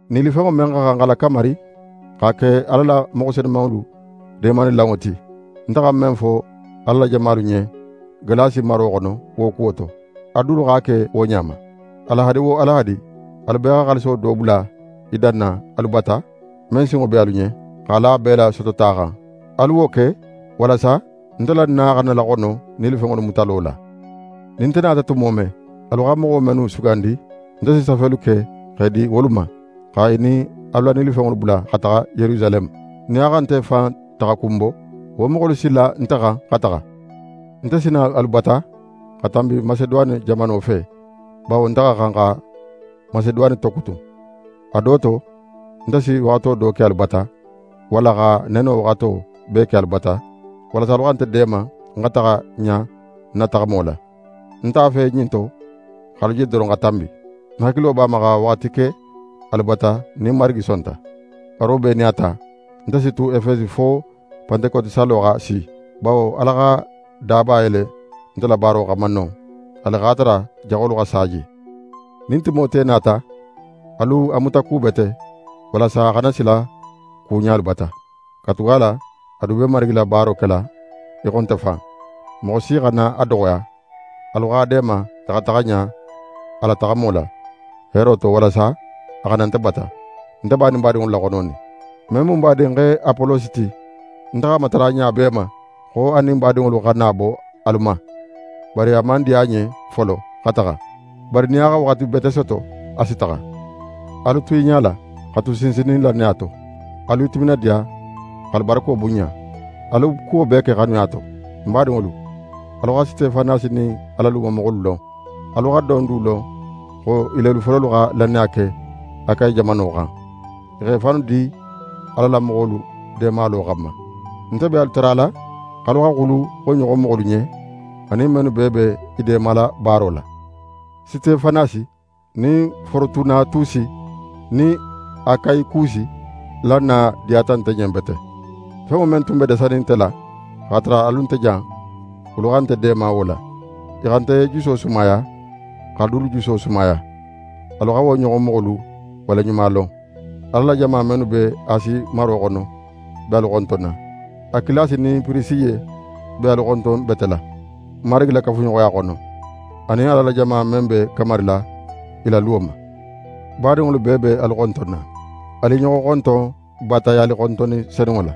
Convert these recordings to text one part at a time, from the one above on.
Nilifenŋo men xa xan xa lakamari, x'a ke Ala la moxo senumanŋolu deemalilanŋo ti, nte xa men fo Ala la jamalu ɲen Galasi maro xono wo kuwo to, alu dulu x'a ke wo ɲa ma. Alahadi wo alahadi, alu bee xa xaaliso do bula í danna alu bata, men sinŋo be alu ɲen, x'a la bee la sotota xan. Alu wo ke, walasa nte la na xana laxono nilifenŋolu mutalo la. Nin nte nata tumo men, alu xa moxo mennu sugandi, nte si safelu ke x'e di wolu ma, xa i nin alu la nilifenŋolu bula xa taxa Yerusaleme. Nin a xa nte fan taxakun bo, wo moxolu si la nte xan xa taxa. Nte si na alu bata xa tanbi Maseduwane jamano fe; bawo nte xa xan xa Maseduwane tokutun. A do to, nte si waxato do ke alu bata, walla xa neno waxato bee ke alu bata, walasa alu xa nte deema ń xa taxa ɲa ń na taxamo la. Ń nte a fe ɲin to x'alu je doron xa tanbi. Ń hakilo b'a ma xa waxati ke alu bata nin Marigi sonta. Bari wo bee nin a ta, nte si tu Efesi fo Pantekoti sallo xa si. Bawo Ala xa daba yele nte la baaro xanma non, haali x'a tara jaxolu xa sa je. Nin Timote nata, alu a mutakubete, walasa a xana sila ku ɲa alu bata. Katugala a du be Marigi la baaro kela í xo nte fan. Moxo si xana a doxoya. Alu x'a deema a xa taxa ɲa a la taxamo la, heero to, walasa a xa na nte bata. Nte b'a nin badinŋolu laxononin. Men mu n badinxe Apolosi ti, nte x'a matara ɲa bee ma xo a nin badinŋolu xa na bo alu ma. Bari a man diya a ɲen folo xa taxa. Bari nin a xa waxati bete soto, a si taxa. Alu tu i ɲala, xa tu sinsinnin lannaya to. Alu i timinadiya, x'alu barako bunɲa. Alu kuwo bee ke xanuya to. Ń badinŋolu, alu xa Sitefanasi nin a la lumamoxolu lon. Alu xa don du lon xo i lelu fololu xa lannaya ke Akayi jamano xan. I x'e fannu di Ala la moxolu deemalo xanma. Nte be alu tarala, x'alu xa xulu wo ɲoxon moxolu ɲen, anin mennu bee be i deemala baaro la. Sitefanasi nin Forotunatusi nin Akayikusi la na diyata nte ɲen bete. Fenŋo men tun dasata nte la, x'a tara alu nte jan, wolu xa nte deema wo la. I xa nte juso sumaya, x'alu dulu juso sumaya. Alu xa wo ɲoxon moxolu waleɲumalon. Ala la jama mennu be Asi maro xono be alu xontonna. Akilasi nin Pirisiye be alu xontonbetela Marigi la kafuɲoxoya xono, anin Ala la jama men be kamarila i la luwo ma. Badinŋolu bee be alu xontonna. Alu i ɲoxo xonton baatayalixontonni senunŋo la.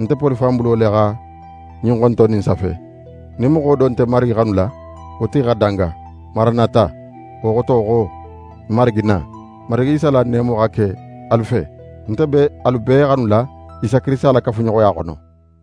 Nte Poli fan bulo le xa ɲin xontonni in safe. Nin moxo do nte Marigi xanula, wo tigi xa danga! Maranata, wo xoto xo: N Marigi, na! Marigi Isa la neemo xa ke alu fe. Nte be alu bee xanula Isa Kirisita la kafuɲoxoya xono.